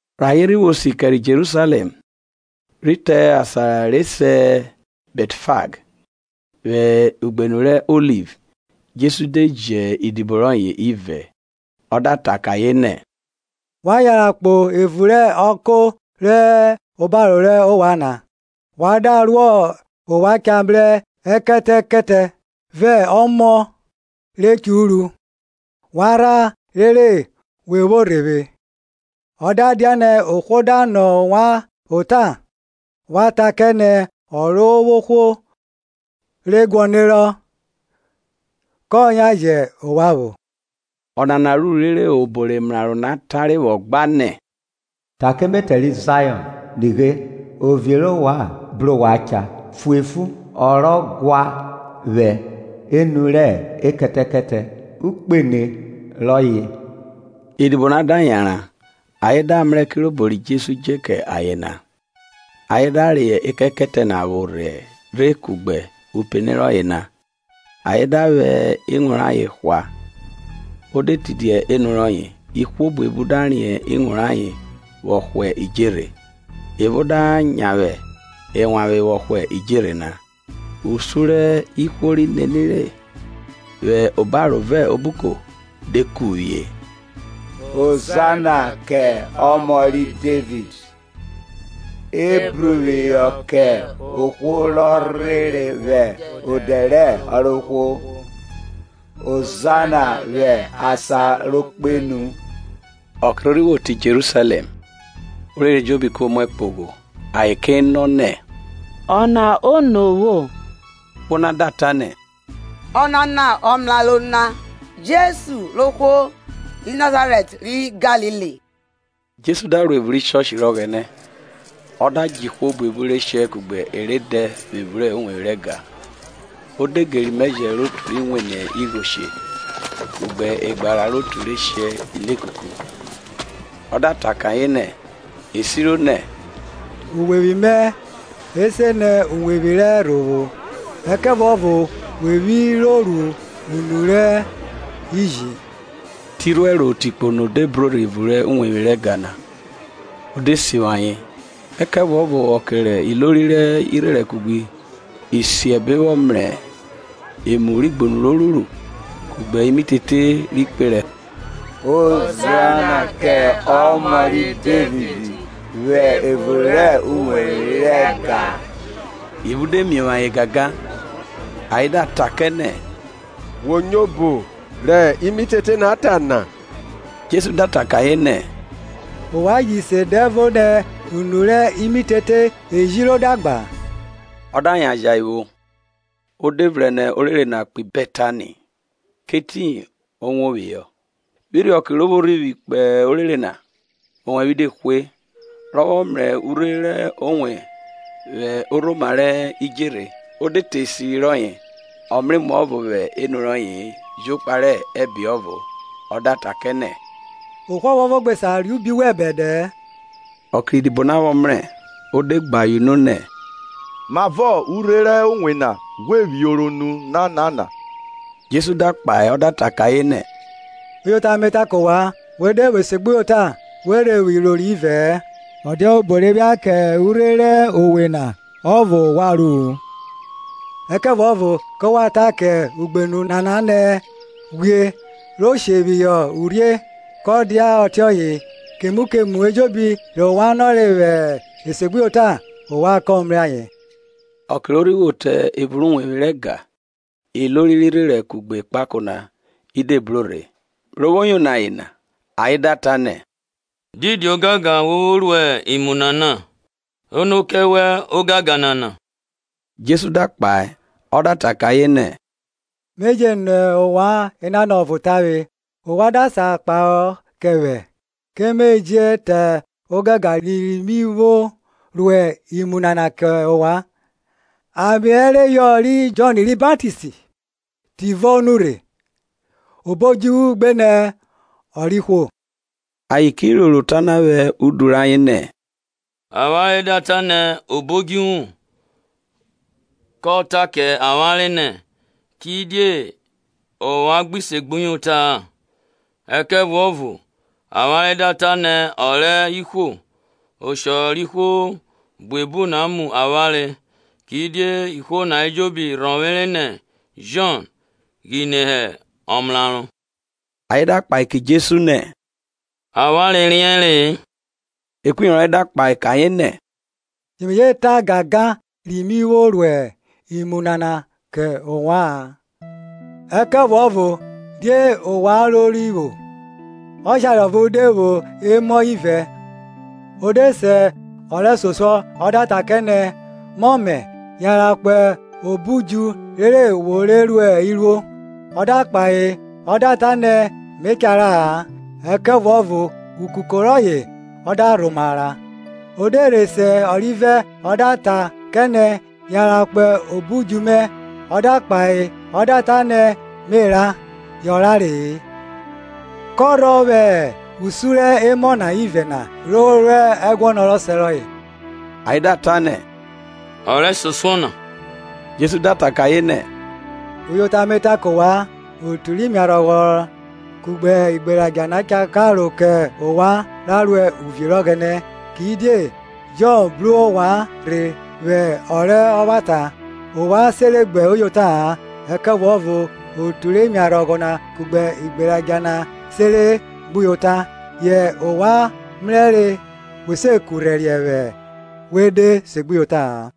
Rẹ ayen rhi vwo si kẹrẹ Jerusalẹm, rhi te asan re sẹ Bẹtfag, vwẹ ugbenu rẹ Oliv, Jesu de ji idibo rọye ivẹ, ọ da ta kẹ ayen nẹ, wa yanran kpo evun rẹ ọko rọ hẹ obaro rẹ ovwan na, wa da ruọ ovwan cha mrẹ ẹkẹtẹkẹtẹ vẹ ọmọ re churu; wa rhan rere we vwo rhe vwe. Ọ da dianẹ ohwo da nọ ovwan ota, wa ta kẹ nẹ, Ọrovwohwo re guọnerọ; kọ yan jẹ ovwan vwo. Ọnana ruru rere obo rẹ emraro na tare vwọ gba nẹ, Ta kẹ ẹmẹtẹ ri Zayọn, Nighe, ovie rẹ ovwan bru ovwan cha, Fuefu, ọ rọ gua vwẹ enu rẹ ẹkẹtẹkẹtẹ, upene rọyẹ. Idibo na da yanran, ayen da mrẹ kirobo ri Jesu dje kẹ ayen na. Ayen da reyọ ekẹtẹkẹtẹ na vwo rhe kugbe upene rọye na, ayen da vwẹ iwun rayen hwa; o de tidia enu rọye. Ihwo buebu da riẹn iwun rayen vwọ hwa idjerhe; evo da nyavwe ewanvwe vwọ hwa idjerhe na. Usun rẹ ihwo ri nenire vwẹ obaro vẹ obuko, de kuvwie, Hozana kẹ Ọmọ ri Devid; Ebruphihọ kẹ ohwo rọ rhere vwẹ odẹ rẹ Ọrovwohwo; Hozana vwẹ asan ro kpenu. Ọke ro rhi vwo te Jerusalẹm, orere ejobi ko muẹ kpogho, ayen ke nọ nẹ, Ọna ono vwo? Ihwo na da ta nẹ, Ọnana ọmraro na, Jesu rẹ ohwo ri Nazarẹt ri Galili. Jesu da ro evun rẹ uwevwi rẹ Ọghẹnẹ, ọ da djẹ ihwo buebu re she kugbe e re dẹ vwẹ evun uwevwi rẹ ẹga, o de geri imeje rẹ otu ri wene igho she, kugbe egbara rẹ otu re shẹ ilekuku; Ọ da ta kẹ ayen nẹ, e siro nẹ, Uwevwi mẹ e se nẹ uwevwi rẹ ẹrhovwo; ẹkẹvuọvo we vwi ro ru unu rẹ iji. Te irhuẹro te ikpono de bro rhe evun rẹ uwevwi rẹ ega na; o de sivwi ayen. Ẹkẹvuọvo ọke rẹ ilori rẹ irherẹn kugbe isiẹbe vwọ mrẹ emu rẹ igbunu ro ruru, kugbe imitete ri kperẹ Hozana kẹ ọmọ ri Devid vwẹ evun rẹ uwevwi rẹ ẹga na, ivun de miovwo ayen gangan. Ayen da ta kẹ nẹ, Wo nyo obo rẹ imitete na ta na? Jesu da ta kẹ ayen nẹ E; ovwan ji se dẹvo nẹ, Unu rẹ imitete ejiro da gba? Ọ da yan jẹ ayen vwo, o de vrẹn nẹ orere na kpo Bẹtani, kẹ oboyi o wo phihọ. Vwẹ irhiọke ro vwo rhivwi kpo orere na, owẹvwe de hwe. Rọ vwọ mrẹ urhe rẹ owe vwẹ orhoma rẹ idjerhe, o de te esiri rọye, ọ mrẹ emuọvo vwẹ enu rọye-e; jokpa rẹ ẹbe ọvo; ọ da ta kẹ nẹ, Ohwo ọvuọvo gbe sa re ubi wẹn bẹdẹ-ẹ. Ọke rẹ idibo na vwọ mrẹ, o de gbe ayen unu nẹ, Mavọ urhe rẹ owe na ghwe vwioro nu nanana? Jesu da kpahe ọ da ta kẹ ayen nẹ, Uyota me ta kẹ ovwan, We de vwo esegbuyota, we rhe vwo iroro ivẹ-ẹ, ọ dia obo re phia kẹ urhe rẹ owe na ọvo ovwan ru-u, ẹkẹvuọvo ke wa ta kẹ ugbenu nana nẹ, ghwie re she phihọ urhie, kọ dia ọtiọye. Kemu kemu ejobi rẹ ovwan nọre vwẹ esebuyota, ovwan ke mrẹ ayen. Ọke ro rhi vwo te evun rẹ uwevwi rẹ ẹga, ilori rẹ irherẹn kugbe ekpako na de bro rhe, ro vwo yono ayen na, ayen da ta nẹ, Didi ogangan wo vwo ruẹ imu nana? Ono kẹ wẹ ogangan nana? Jesu da kpahe ọ da ta kẹ ayen nẹ, Me je nọ ovwan enanọ ọvo tavwe, ovwan da sa kpahọ kẹ vwẹ, Ke me je ta ogangan ri mi vwo ruẹ imu nana kẹ ovwan. Ame ẹreyọ ri Jọn ri Baptist tivọ o nurhe? obo odjuvwu gbenẹ ọ rẹ ihwo? Ayen ki roro ota na vwẹ udu rayen nẹ, avwanre da ta nẹ obo odjuvwu; kọ ta kẹ avwanre nẹ, Kidie ovwan gbi segbuyota-a. Ẹkẹvuọvo avwanre da ta nẹ, Ọ rẹ ihwo, ọshọ rẹ ihwo buebu na mu avwanre, kidie ihwo na ejobi rhọvwere nẹ Jọn ghine hẹ ọmraro. Ayen da kpahe kẹ Jesu nẹ, Avwanre riẹnre-e. Ekpuyovwi rọye da kpahe kẹ ayen nẹ, ye me gbe je ta ogangan ri mi vwo ruẹ imu nana kẹ ovwa-an. Ẹkẹvuọvo die ovwan rori vwọ? Ọshare ọvo de vwo emọ ivẹ; ọ de se ọ rẹsosuọ ọ da ta kẹ nẹ, Mọmẹ, yanran kpo obo udju rere wo re ru iruo. Ọ da kpahe ọ da ta nẹ, me cha ra-a: ẹkẹvuọvo ukuko rọye ọ da rhoma ra. Ọ de rhe se ọrivẹ ọ da ta kẹ nẹ, yanran kpo obo udju mẹ. Ọ da kpahe ọ da ta nẹ me ra, yọ rare-e. Kọrhọ vwẹ usu rẹ emọ na ivẹ na ri ru ẹguọnọ rẹ ọsẹ rọye? Ayen da ta nẹ Ọ rẹsosuọ na, Jesu da ta kẹ ayen nẹ, Uyota me ta kẹ ovwan, otu rẹ imiarhọghọ kugbe igberadja na cha karo kẹ ovwan ra ro uvie rẹ Ọghẹnẹ. Kidie Jọn bru ovwan rhe vwẹ ọ rẹ ọvwata, ovwan sere gbuyota-a, ẹkẹvuọvo otu rẹ imiarhọghọ kugbe igberadja na sere gbuyota; ovwan re mrẹrẹ dede na se kurhẹriẹ we de segbuyota-a.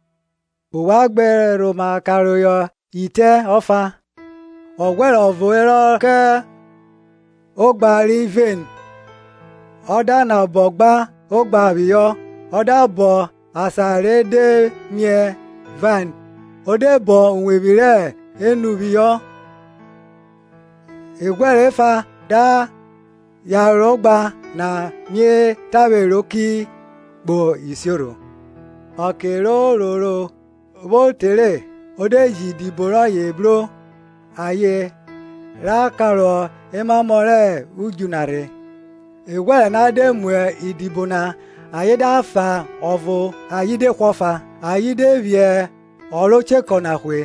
Ovwan gbe rhoma kerhọn rẹ itẹ ọfa. Ọghwẹrẹ ọvo herọ rọ kọn ogba ri vain, ọ da nabọ gba ogba phihọ, ọ da bọn asan re de miẹ vain, ọ da bọn uwevwi rẹ enu phihọ, eghwẹrẹ efa da yaro ogba na mie tavwe ro ki kpo isiorho. Ọke rẹ ororo vwo te re, o de ji odibo rọye bru ayen ra ra kọrọ emamo rẹ udju na rhe. Eghwẹrẹ na de mu idibo na, ayen da fa ọvo ayen hwe ọfa, ayen de phi ọ ro chekọ na ghwu.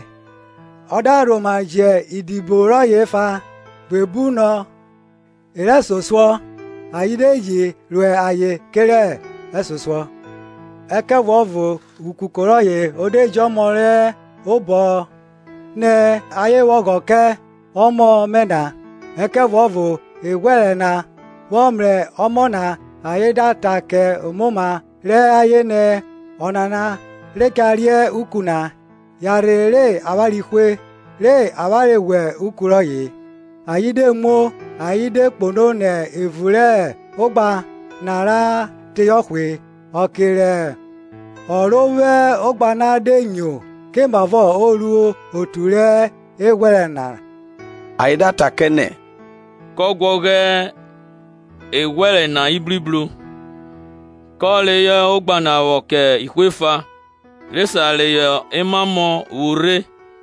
Ọ da rhoma ji idibo rọye efa, buebu nọ e rẹsosuọ; ayen de ji ru ayen kerẹ e rẹsosuọ. Ẹkẹvuọvo ukuko rọye o de ji ọmọ re obọ rọye nẹ, ayen vwẹ ọghọ kẹ ọmọ mẹ na. Ẹkẹvuọvo, eghwẹrẹ na vwọ mrẹ ọmọ na ayen da ta kẹ omoma rẹ ayen nẹ, Ọnana re cha reuku na; yanrhe re avwanre hwe, re avwanre reyọ uku rọye na. Ayen de muo, ayen de kpono nẹ evun rẹ ogha na ra teyọ hwe. Ọke rẹ ọ ro vwo ogba na de nyo komavọ o ru otu rẹ eghwẹrẹ na? Ayen da ta kẹ nẹ, Kọ guọghọ eghwẹrẹ na ibribro, kọ reyọ ogba na vwọ kẹ ihwo efa, re sa reyọ emamọ vwo rhe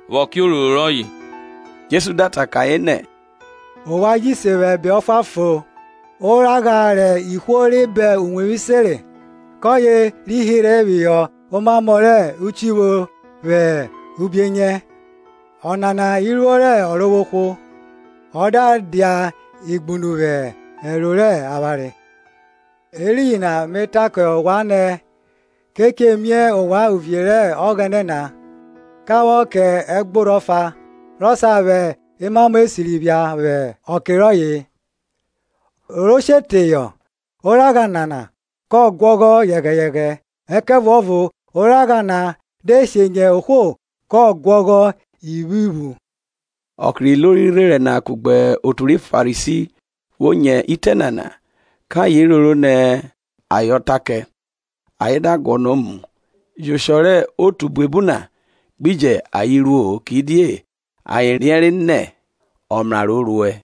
vwẹ ọke ororo rọye. Jesu da ta kẹ ayen nẹ, Ovwan ji se vwẹ ẹbe ọfuanfon na, Oragha rẹ ihwo re bọn uwevwi senre, Kọye ri hirhe phihọ omamọ rẹ uchivwo vwẹ ubienyẹ. Ọnana iruo rẹ Ọrovwohwo, Ọ da dia igbunu vwẹ ẹro re avwanre. Eriyin na me ta kẹ ovwan nẹ, Ke che mie ovwan uvie rẹ Ọghẹnẹ na, ka vwọ kẹ ẹgborho ọfa, ro sa vwẹ emamo esiri phia vwẹ ọke rọye. Ohwo ro she teyọ oragha nana kọ guọghọ yẹghẹyẹghẹ; ẹkẹvuọvo oragha na de she nyẹ ohwo kọ guọghọ ivwivwuvwu. Ọke rẹ ilori rẹ irherẹn na kugbe otu ri Farisi vwo nyo itẹ nana, kẹ ayen roro nẹ ayen ọ ta kẹ. Ayen da guọnọ muo, yẹ oshọ rẹ otu buebu na gbi jẹ ayen ruo-o, kidie ayen riẹnre nẹ ọmraro o ruẹ.